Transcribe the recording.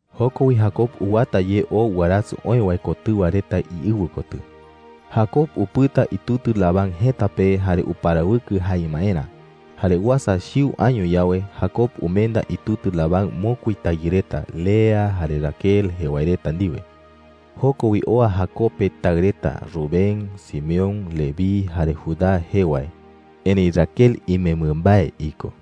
Joko wi Jacob uwata ye oo warasɨ oë wae kotɨwa reta iɨwɨ kotɨ. ( Jacob upɨta itutɨ Labán jëta pe jare uparawɨkɨ jae imaerä. Jare uasa chiu año yawe, Jacob umenda itutɨ Labán mokui tayɨ reta, Lea jare Raquel jee wae reta ndiwe. Joko wi oa Jacob pe taɨ reta Rubén, Simeón, Leví, jare Judá jee wae. Erëi Raquel imembɨ mbae iko.)